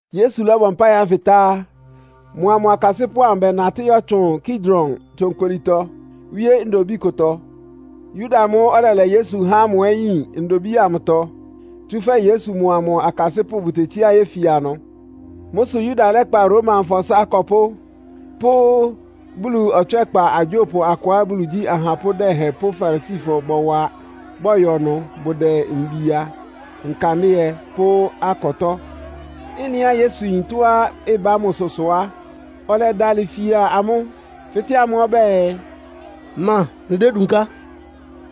Yesu lɔ́bɔ mpáɩ ánfɩ tá á, mʋa mʋ akasɩ́pʋ́ amʋ bɛnatɩ́ yɔ́tsʋn Kidron tsonkolitɔ wíé ndobíi kʋtɔ. Yuda amʋ́ʋ́ ɔlɛlɛ Yesu há ámʋ ɛ́ yin ndobíi amʋtɔ, tsúfɛ́ Yesu mʋa mʋ akasɩ́pʋ́ bʋtetsíá yéfia ɩnʋ. Mʋ́ sʋ Yuda lɛ́kpa Romafɔ ɩsá akɔpʋ́ pʋ́ Bulu ɔtswɛ́kpa agyópʋ akʋá Bulu igyí ahapʋ́ dɛhɛn pʋ́ Farisifɔ bɔwa, bɔyɔ ɩnʋ. Bʋdɛ mbia, nkandɩ́ɛ pʋ́ akɔtɔ́. Ɩ́nɩá Yesu yin tɔ́á ɩbá mʋsʋ sʋ á, ɔlɛdalɩ fia amʋ́, fɩ́tɛ́ amʋ́ ɔbɛ́ɛ, “Ma mlɩdédunká?”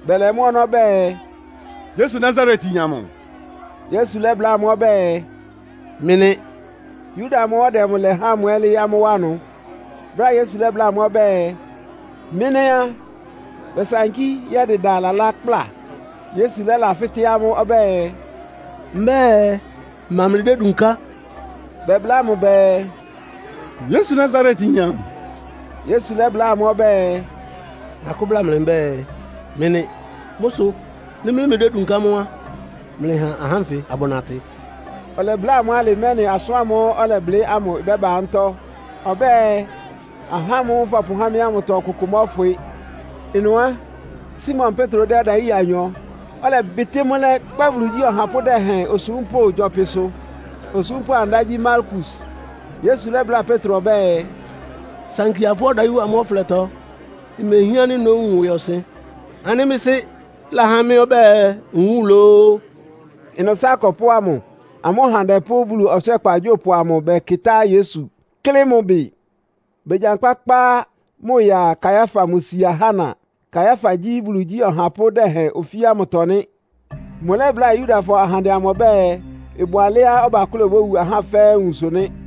Bɛlɛ mʋ́ ɔnɔ́ bɛɛ, “Yesu Nasaretyin amʋ.” Yesu lɛ́bláa amʋ́ ɔbɛ́ɛ, “Mɩ́ nɩ́.” (Yuda amʋ́ʋ́ ɔdɛ mʋ lɛ há ámʋ ɛ́ lɩ́ɩ́ amʋ́ wá ɩnʋ.) Brɛ́á Yesu lɛ́bláa amʋ́ ɔbɛ́ɛ, “Mɩ́ nɩ́!” á, bɛsankí yɛ́dɩda lalá kpla. Yesu lɛ́lafɩ́tɛ́ amʋ́ ɔbɛ́ɛ, “Mbɛ́ɛ, ma mlɩdédunká?” Bɛbláa mʋ bɛɛ, “Yesu Nasaretyin amʋ.” Yesu lɛ́bláa amʋ́ ɔbɛ́ɛ, “Nakʋ́ bláa mlɩ mbɛ́ɛ, mɩ́ nɩ́. Mʋ́ sʋ nɩ́ mɩ́ mlɩdédunká mʋ́ á, mlɩha ahá ánfɩ abʋnatɩ.” (Ɔlɛbláa amʋ́ alɩ, mɛ́nɩ asʋ́n ámʋ́ʋ́ ɔlɛblɩ́ ámʋ ɩbɛ́ba mʋ́tɔ́. Ɔbɛ́ɛ, “Ahá ámʋ́ʋ́ fɔpʋhá mɩ́ ámʋtɔ ɔkʋkʋ mɔ́fwɩ.”) Ɩnʋ á, Simon Petro dɛ́ ɔdayí ɩya anyɔ, ɔlɛbɩtɩ́ mʋ́ lɛ́, kpá Bulu igyí ɔhapʋ́ dɛhɛn osúmpʋ́ gyɔpɩ ɩsʋ. Osúmpʋ́ amʋ ɩdá gyí Malkus. Yesu lɛ́bláa Petro ɔbɛ́ɛ, “Sankia fʋ́ ɔdayí wa mʋ́ ɔflɛtɔ! Imehián ánɩ́ nówun ɩwɩɔsɩn ánɩ́ mɩ́ Sɩ́ lahá mɩ́ ɔbɛ́ɛ nwúun lóó?” Ɩnʋ ɩsá akɔpʋ́ ámʋ, amʋ́ ɔhandɛ pʋ́ Bulu ɔtswɛ́kpa agyópʋ amʋ bɛkɩtá Yesu, klɩ́ mʋ ɩbɩ. Begyankpá kpá mʋ ya Kaiafa mʋ sia Hana. Kaiafa gyí Bulu igyí ɔhapʋ́ dɛhɛn ofí ámʋtɔ nɩ́. Mʋlɛ́bláa Yudafɔ ahandɛ amʋ ɔbɛ́ɛ, ɩbʋ alɛ́á ɔbakʋ́lɛ obówu ahá fɛ́ɛ́ nwunsʋ nɩ́.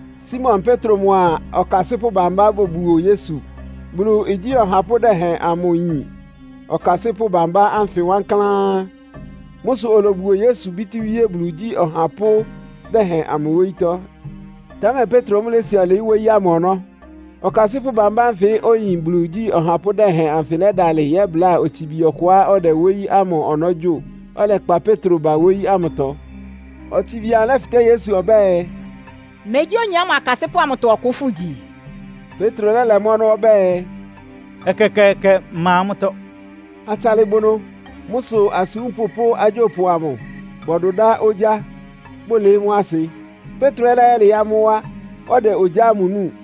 Simon Petro mʋa ɔkasɩ́pʋ́ bambá bobuo Yesu. Bulu igyí ɔhapʋ́ dɛhɛn amʋ yin ɔkasɩ́pʋ́ bámbá ánfɩ wankláán. Mʋ́ sʋ olobuo Yesu bítíwíé Bulu igyí ɔhapʋ́ dɛhɛn amʋ wóyítɔ́. Támɛ Petro mʋ́ lési ɔlɩɩ́ wóyí ámʋ ɔnɔ́. Ɔkasɩ́pʋ́ bámbá ánfɩ óyin Bulu igyí ɔhapʋ́ dɛhɛn anfɩ lɛ́dalɩ yɛ́bláa otsibi ɔkʋá ɔdɛ wóyí ámʋ ɔnɔ́ gyo, ɔlɛkpa Petro ba wóyí ámʋtɔ. Otsibi amʋ lɛ́fɩtɛ́ Petro ɔbɛ́ɛ, “Megyí oyin ámʋ akasɩ́pʋ́ amʋtɔ ɔkʋ fʋ́gyi?” Petro lɛ́lɛ mʋ́ ɔnɔ́ ɔbɛ́ɛ, “Ɛkɛkɛɛkɛ. Mma amʋ́tɔ́.” Atsalɩ bʋ ɩnʋ. Mʋ́ sʋ asúmpʋ́ pʋ́ agyópʋ amʋ bɔdʋdá ogyá, bʋlɩɩ́ mʋ́ asɩ. Petro ɛ́ lɛ́yɛlɩɩ́ amʋ́ wá, ɔdɛ ogyá ámʋ núu.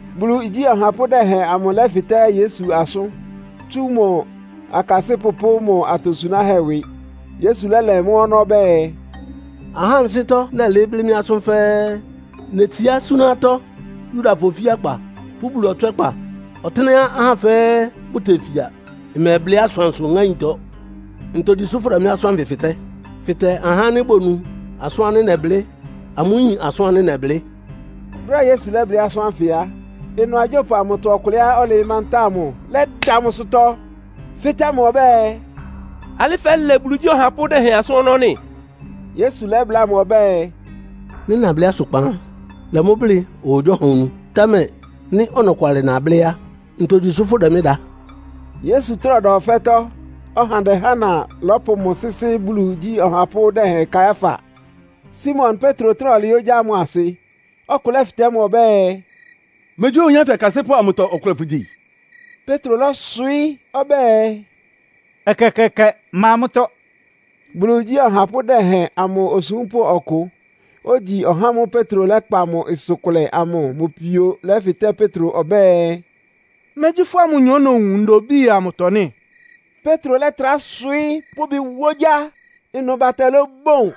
Bulu igyí ɔhapʋ́ dɛhɛn amʋ lɛ́fɩtɛ́ Yesu asʋ́n, tsú mʋ akasɩ́pʋ́ pʋ́ mʋ́ atosunáhɛ́ ɩwɩ. Yesu lɛ́lɛ mʋ́ ɔnɔ́ ɔbɛ́ɛ, “Ahá ansɩ́tɔ́ nɛlɩɩ́ blɩ́ mɩ́ asʋ́n fɛ́ɛ́. Netsiá súná atɔ́ Yudafɔ ofíakpa pʋ́ Bulu ɔtswɛ́kpa, ɔtɩ́nɛ́á ahá fɛ́ɛ́ bʋtefia. Mmɛblɩ́ asʋansʋ ŋáintɔ. Ntogyi sʋ́ fʋ́dɛ mɩ́ asʋ́n ánfɩ fɩtɛ́. Fɩtɛ ahá ánɩ́ bonu asʋ́n ánɩ́ nɛblɩ́. Amʋ́ yín asʋ́n ánɩ́ nɛblɩ́.” Brɛ́á Yesu lɛ́blɩ́ asʋ́n ánfɩ á, ɩnʋ agyópʋ amʋtɔ ɔkʋlɛá ɔlɩɩ́ mantáa mʋ lɛ́da mʋ ɩsʋtɔ, fɩ́tɛ́ mʋ ɔbɛ́ɛ, “Alɩ́ fɛ́lɛ Bulu igyí ɔhapʋ́ dɛhɛn asʋ́n ɔnɔ́ nɩ́?” Yesu lɛ́bláa mʋ ɔbɛ́ɛ, “Nɩ́ nablɩ́ asʋkpan á, lɛ mʋ́ blɩ́ ɔhagyíɔha onu. Támɛ nɩ́ ɔnɔkwalɩ nablɩ́ á, ntogyi sʋ fʋ́dɛ mɩ́ da?” Yesu trá ɔda ɔfɛ́tɔ́ ɔhandɛ Hana lɔ́pʋ mʋ sɩ́sɩ́ Bulu igyí ɔhapʋ́ dɛhɛn Kaiafa. Simon Petro trá ɔlɩɩ́ ogyá ámʋ asɩ, ɔkʋ lɛ́fɩtɛ́ mʋ ɔbɛ́ɛ, “Megyí oyin ánfɩ akasɩ́pʋ́ amʋtɔ ɔkʋlɛ fʋgyi?” Petro lɔ́swɩɩ́ ɔbɛ́ɛ, “Ɛkɛkɛɛkɛ. Mma amʋ́tɔ́!” Bulu igyí ɔhapʋ́ dɛhɛn amʋ osúmpʋ́ ɔkʋ, ogyi ɔhá ámʋ́ʋ́ Petro lɛ́kpa mʋ ɩsʋ kʋlɛ amʋ mʋ pio lɛ́fɩtɛ́ Petro ɔbɛ́ɛ, “Megyí fʋ́a mʋnyɔ nowun ndobíi amʋtɔ nɩ́?” Petro lɛ́trá swɩɩ́ pʋ́ ɩbɩ wá ogyá. Ɩnʋnʋ batɛ lɔ́bɔn.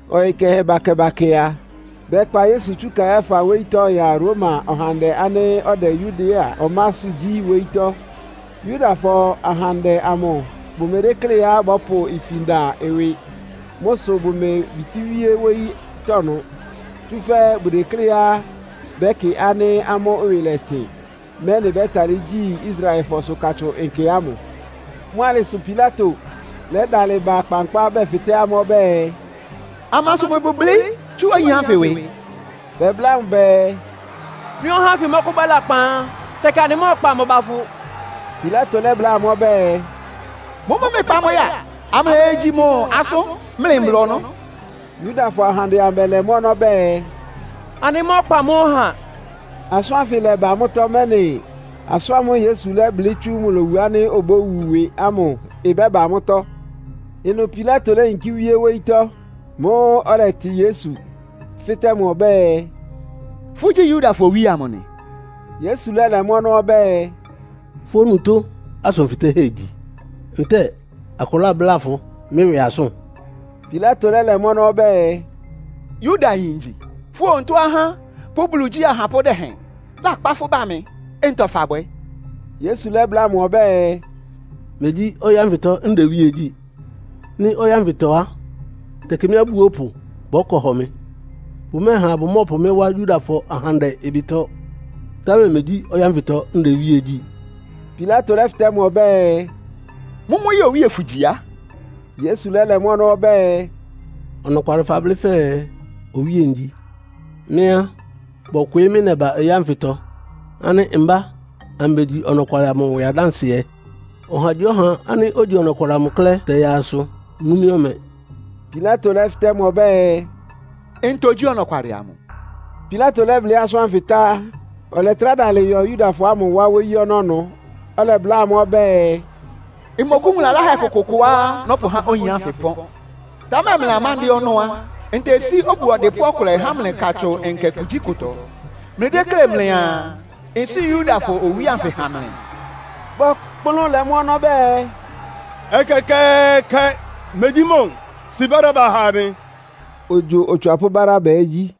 Ɔyɩ kɛhɛ bakɛ-bakɛ a, bɛkpa Yesu tsú Kaiafa wóyítɔ́ ya Roma ɔhandɛ ánɩ́ ɔdɛ Yudea ɔmásʋ́ gyí wóyítɔ́. Yudafɔ ahandɛ amʋ bʋmedékléá bɔ́pʋ ifin da ɩwɩ. Mʋ́ sʋ bʋmebitíwíé wóyítɔ́ ɩnʋ. Tsúfɛ́ bʋdekléá bɛ́kɩ ánɩ́ amʋ́ ɩwɩ lɛtɩn, mɛ́nɩ bɛ́talɩ́ gyi Israelfɔsʋ Katsʋn Nkɛ ámʋ. Mʋ́ alɩ sʋ Pilato lɛ́dalɩ ba kpankpá bɛfɩtɛ́ amʋ́ ɔbɛ́ɛ, “Amansʋ mlɩbʋ blɩ́ tsú oyin ánfɩ ɩwɩ?” Bɛbláa mʋ bɛɛ, “Nɩ́ ɔhá ánfɩ mɔ́kʋ́bwɛ́ lakpan á, tɛkɩ anɩmɛ́kpa mʋ ba fʋ.” Pilato lɛ́bláa amʋ́ ɔbɛ́ɛ, “Mʋ́mʋ́ mlɩkpa mʋ ya, amlɩyegyi mʋ asʋ́n mlɩ mbla ɔnɔ́.” Yudafɔ ahandɛ amʋ bɛlɛ mʋ́ ɔnɔ́ bɛɛ, “Anɩmá ɔkpa mɔ́ ɔha.” (Asʋ́n ánfɩ lɛ́ba mʋ́tɔ́, mɛ́nɩ asʋ́n ámʋ́ʋ́ Yesu lɛ́blɩ́ tsú mʋ lowu ánɩ́ obówu ɩwɩ ámʋ ɩbɛ́ba mʋ́tɔ́.) Ɩnʋ Pilato léyinkí wíé wóyítɔ́. Mʋ́ʋ́ ɔlɛtɩ Yesu, fɩ́tɛ́ mʋ ɔbɛ́ɛ, “Fʋ́gyí Yudafɔ owíe amʋ nɩ?” Yesu lɛ́lɛ mʋ́ ɔnɔ́ ɔbɛ́ɛ, “Fʋ́ onutó asʋn fɩtɛ́hɛ́ igyi, ntɛ́ɛ akʋ lábláa fʋ mɩ́ ɩwɩ asʋ́n?” Pilato lɛ́lɛ mʋ́ ɔnɔ́ ɔbɛ́ɛ, “Yudayin ngyi? Fʋ́ onutó ahá pʋ́ Bulu igyí ahapʋ́ dɛhɛn lɛ́kpa fʋ́ ba mɩ. Ntɔ fabwɛ́?” Yesu lɛ́bláa mʋ ɔbɛ́ɛ, “Megyí ɔyɩ́ ánfɩtɔ ndɛ iwíe gyí. Nɩ́ ɔyɩ́ ánfɩtɔ á, tɛkɩ mɩ́ abúopʋ bɔ́kɔ hɔ mɩ. Bʋmɛ́ɛha bʋmɔ́ɔpʋ mɩ́ wá Yudafɔ ahandɛ ɩbɩtɔ, támɛ megyí ɔyɩ́ ánfɩtɔ ndɛ iwíe gyí!” Pilato lɛ́fɩtɛ́ mʋ ɔbɛ́ɛ, “Mʋ́mʋ́ yɛ́ɛ owíe fʋgyi á?” Yesu lɛ́lɛ́ mʋ́ ɔnɔ́ ɔbɛ́ɛ, “Ɔnɔkwalɩ fablɩ́ fɛɛ Owíe ngyi. Mɩ́ á, bɔkwɩɩ́ mɩ́ nɛba ɔyɩ́ ánfɩtɔ ánɩ́ mbá ambegyi ɔnɔkwalɩ amʋ ɩwɩ adánsɩɛ. Ɔhagyíɔha ánɩ́ ogyi Ɔnɔkwalɩ amʋ klɛ́ tɛyaa asʋ nú mɩ́ ɔmɛ.” Pilato lɛ́fɩtɛ́ mʋ ɔbɛ́ɛ, “Ntɔ gyí ɔnɔkwalɩ amʋ?” Pilato lɛ́blɩ́ asʋ́n ánfɩ tá á, ɔlɛtrá dalɩ yɔ Yudafɔ ámʋ wá wóyí ɔnɔ́ ɩnʋ. Ɔlɛbláa amʋ́ ɔbɛ́ɛ, “Mmɔkʋ́wun lalahɛ kʋkʋʋkʋá nɔ́pʋhá oyin ánfɩ ɩpɔ́n. Támɛ mlɩ amándɩ́ɛ́ ɔnɔ́ á, ntesí obu ɔdɩpʋ́ ɔkʋlɛ há mlɩ Katsʋn Nkɛ kugyíkʋtɔ. Mlɩdéklé mlɩaa, nsíi Yudafɔ Owíe anfɩ ha mlɩ?” Bɔkplʋ́n lɛ mʋ́ ɔnɔ́ bɛɛ, “Ɛkɛkɛɛkɛ! Megyí mʋ. Si Baraba ha anɩ.” (Ogyo otswapʋ́ Baraba ɛ́ gyí).